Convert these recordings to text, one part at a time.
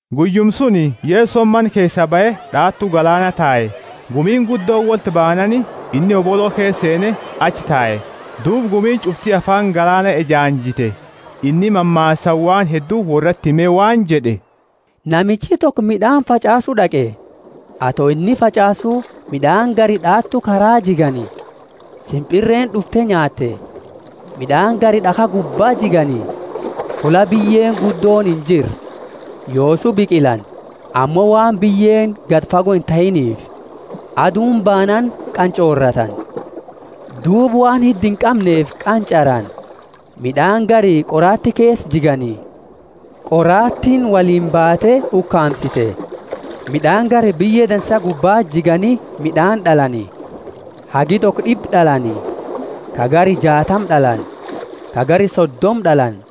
Guyyuma suni, Yesoni mana keesaa bahe d'aatu galaana tae. Gumiini guddooni wolti baanaani inni hobolo keesa seene achi tae, duuba gumiini ch'ufti afaani galaana ejaanjite. Inni mammaasaani waan heddu worrati hime waan jed'e, Namichi toko mid'aani fach'aasu d'aqe. Ato inni fach'aasu mid'aani gari d'aatu karaa jigani, simpirreeni d'ufte nyaatte. Mid'aani gari d'akha gubbaa jigani, fulla biyyeeni guddooni injirre. Yoosu biqilani, ammo waan biyyeeni gadi fago intahiniifi, aduuni baanaani qanch'ooratani, duuba waan hidda inqamneefi qanch'arani. Mid'aani gari qoraati keesa jigani, qoraatiini woliini baate ukaamsite. Mid'aani gari biyye dansa gubbaa jigani; mid'aani d'alani, hagi toko d'ibba d'alani, ka gari jaatama d'alani, ka gari sodoma d'alani.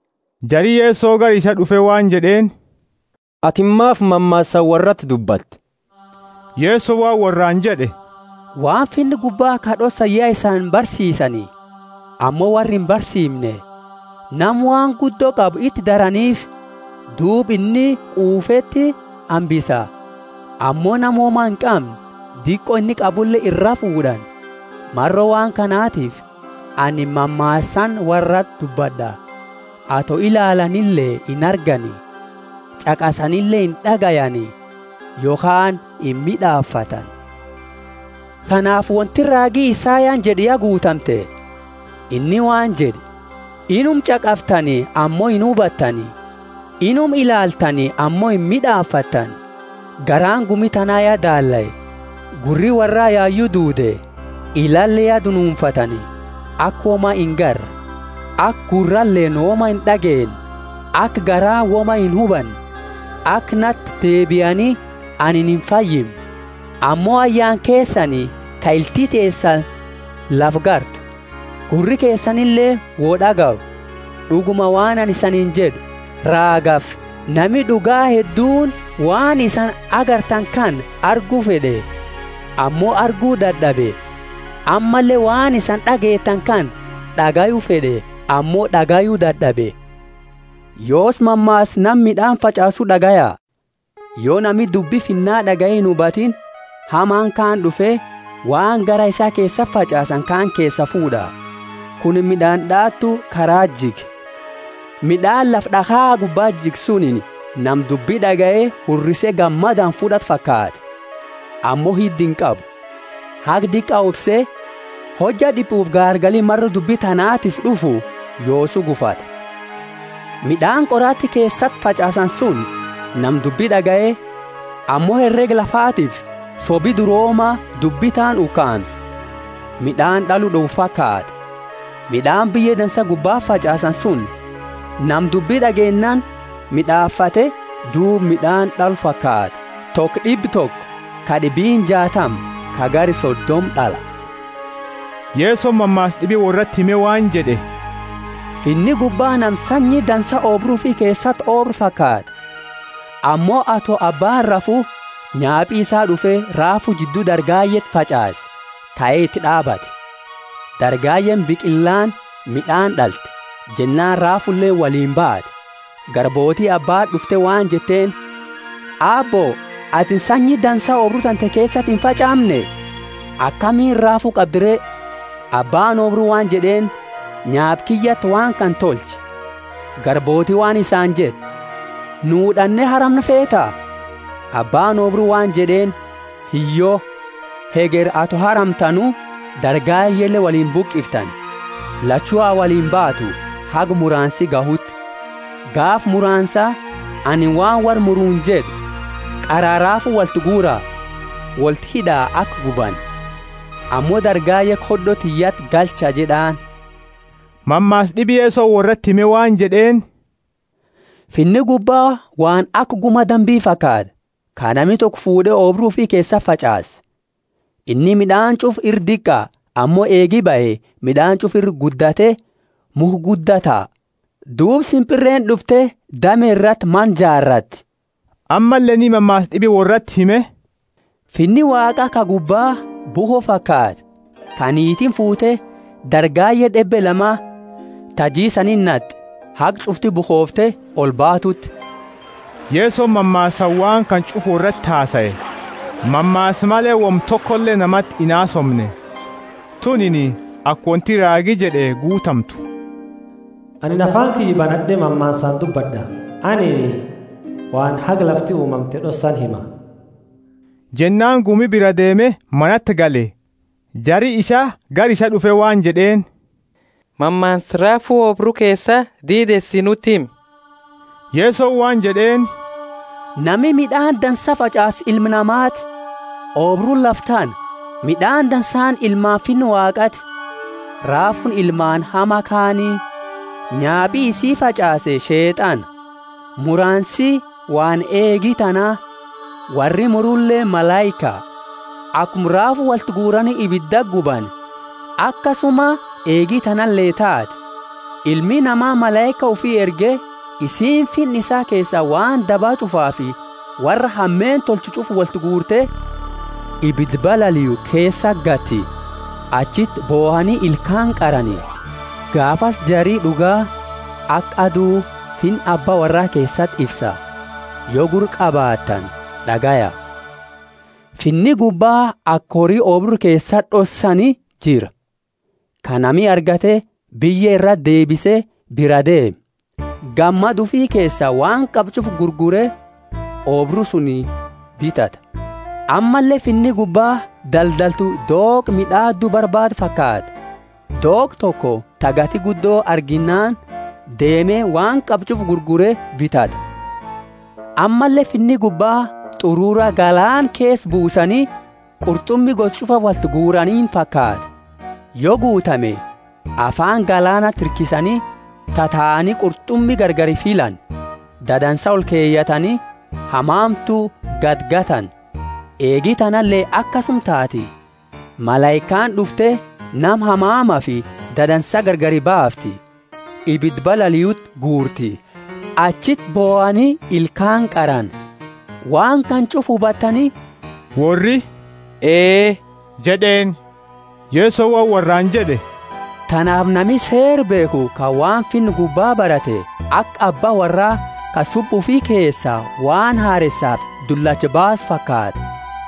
Jari Yeso gara isaa d'ufe waan jed'eeni, Atini maafi mammaasaani worrati dubbatta? Yesoni waan worraani jed'e, waan Finna gubba ka d'ossani ya isani barsiisani, ammo worra imbarsiimne. Nama waan guddo qabu iti daraniifi, duuba inni quufeti hambisa; ammo nama woma inqamne diqo inni qabule iraa fuud'ani. Maro waan kanatifi anini mammaasaani worrati dubbad'a. Ato ilaalanile inargani, ch'aqasanile ind'agayani, yokhaani imid'aafatani. Tanaafi wonti raagi Isayani jed'e ya guutamte. Inni waan jed'e: Inuma ch'aqaftani ammo inhubattani; inuma ilaaltani ammo imid'aafattani. Garaani gumi tana ya daallae. Gurri worra yayu duude, ilaale ya dunuunfatani, aka woma ingarre, aka gurraleeni woma ind'ageenne aka garaani woma inhubanne, aka nati deebiani, anini imfayimne. Ammo ayaana keesani ka ilti teesani lafa gartu, gurri keesanileeni woi d'agayu. D'uguma, waan anini isaniini jed'u, raagafi nami d'uga hedduuni waan isani agartani kana argu fed'e, ammo argu dad'abe; ammalle waan isani d'ageettani kana d'agayu fed'e, ammo d'agayu dad'abe. Yoosi mammaasa nama mid'aani fach'aasu d'agaya. Yo nami dubbi Finna d'agaye inhubatiini, hamaani kaani d'ufe, waan garaa isaa keesati fach'aasani kaani keesaa fuud'a. Kunini mid'aani d'aatu kara jige. Mid'aani lafa d'akha gubba jige sunini nama dubbi d'agaye hurrise gammadaani fud'atu fakaata. Ammo hidda inqabu, haga diqa obse, hojja d'ipufi gaargali maro dubbi tanaatiifi d'ufu yoosu gufata. Mid'aani qoraati keesati fach'aasani suni nama dubbi d'agaye, ammo herega lafatiifi sobi durooma dubbi taani ukaamse, mid'aani d'alu d'owu fakaata. Mid'aani biyye dansa gubbati fach'aasani suni nama dubbi d'ageennaani mid'aafate, duuba mid'aani d'alu fakaata; toko d'iba toko, ka d'ibiini jaatama, ka gari sodoma d'ala. Yesoni mammaasa d'ibi worrati hime waan jed'e: Finni gubba nama sanyi dansa oobru ufi keesati oobre fakaata. Ammo ato abbaani rafu, nyaapi isaa d'ufe, raafu jiddu dargayeti fach'aase, kae iti d'aabate. Dargayeeni biqillaani mid'aani d'alte, jennaani raafuleeni woliini bat'e. Garbooti abbaati d'ufte waan jetteeni, Aabbo, atini sanyi dansa oobru tante keesati imfach'aamne? Akamiini raafu qabdi re? Abbaani oobru waan jed'eeni, Nyaapa kiyyati waan kana tolche. Garbooti waan isaani jette, Nu d'anne haramnu feeta? Abbaani oobru waan jed'eeni, Hiyyo; hegeri ato haramtanu dargayele woliini bubuqiftani. Lachu ha woliini baatu, haga muraansi gahuuti. Gaafa muraansa, anini waan worra muruuni jed'u, Qara raafu wolti guura, wolti hid'a aka gubani, ammo dargaye khod'o tiyyati galcha jed'aani. Mammaasa d'ibi Yesoni worrati hime waan jed'eeni, Finni gubba waan aka guma dambi fakaata, ka nami toko fuud'e oobru ufi keesati fach'aase. Inni mid'aani ch'ufa ira diqa ammo eegi bahe mid'aani ch'ufa ira guddate mukha gudda taha. Duuba simpirreeni d'ufte dame irati mana jaarati. Ammalle inni mammaasa d'ibi worrati hime, Finni Waaqa ka gubba bukho fakaata, ka niitiini fuute; dargaye d'ebbe lama ta jiisaniti nat'e, haga ch'ufti bukhofte olbatuti. Yesoni mammaasaani waan kana ch'ufa worrati hasae, mammaasa male woma tokole namati inhasoomne. Tunini aka wonti raagi jed'e guutamtu: Anini afaani kiyya banad'e mammaasaani dubbad'a, anini waan haga lafti uumamte d'ossani hima. Jennaani gumi biraa deeme manati gale. Jari isaa gara isaa d'ufe waan jed'eeni, Mammaasa raafu oobru keesa diideesi nuti himi. Yesoni waan jed'eeni, Nami mid'aani dansaa fach'aasu Ilma Namaati; oobruuni lafa tana; mid'aani dansaani ilmaani Finna Waaqati; raafuuni ilmaani Hama Kaani; nyaapi isi fach'aase Sheet'ana. Muraansi waan eegi tana. Worri muruleeni malaika. Akuma raafu wolti guurani ibidaani gubani, akasuma eegi tanale taati. Ilmi Nama malaika ufi erge, isiini Finna isaa keesa waan daba ch'ufaafi worra hameenna tolchu ch'ufa wolti guurte, ibida balaliu keesaa gati; achiti bohani ilkaani qarani. Gaafasi jari d'uga aka adu Finna Abba worraa keesati ifsa. Yo gurra qabaattani, d'agaya. Finni gubba aka hori oobru keesati d'ossani jira, ka nami argate, biyye irati deebise biraa deeme. Gammada ufi keesa waan qabu ch'ufa gurgure oobru suni bitata. Ammalle Finni gubba daldaltu dooqa mid'aadu barbaadu fakaata. Dooqa toko ta gati guddo arginaani deeme waan qabu ch'ufa gurgure bitata. Ammalle Finni gubba t'urura galaana keesa buusani, qurt'umi gosa ch'ufa wolti guuraniini fakaata. Yo guutame, afaani galaanati hirkisani, tataani qurt'umi gargari filani: dadansa olkeyatani, hamamtu gadigatani. Eegi tanale akasuma taati: malaikaani d'ufte nama hamamafi dadansa gargari baafti. Ibida balaliuti guurti, achiti bohani ilkaani qarani. Waan kana ch'ufa hubattani? Worri, Ee jed'eeni. Yesoni waan worraani jed'e, Tanaafi nami seera beekhu ka waan Finna gubba barate, aka abba worraa ka subba ufi keesaa waan hareesafi dullacha baasu fakaata.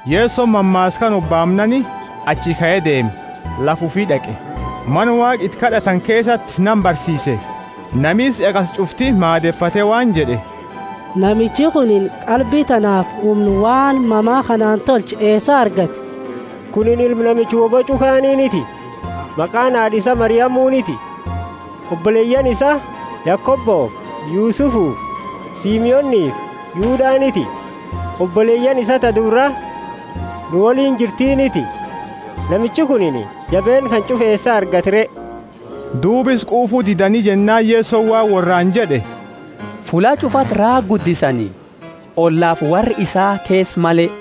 Yesoni mammaasa kana hobaamnaani achi kae deeme lafa ufi d'aqe, Mana Waaqa iti kad'atani keesati nama barsiise. Nami isa ch'aqase ch'ufti maadefate waan jed'e, Namichi kunini qalbi tanaafi humna waan mama kanaani tolchu eesaa argate? Kunini ilma namicha wo boch'u kaaniiniti? Maqaani haad'a isa Mariamuniti? Oboleyaani isaa Yakobofi Yusufufi Simonifi Yudaniti? Oboleyaani isaa ta dubra nu woliini jirtiniti? Namichi kunini jabeenna kana ch'ufa eesa argate re? Duuba isa quufu didani jennaani Yesoni waan worraani jed'e, Fulla ch'ufati raaga guddisani, ollafi worra isaa keesa male.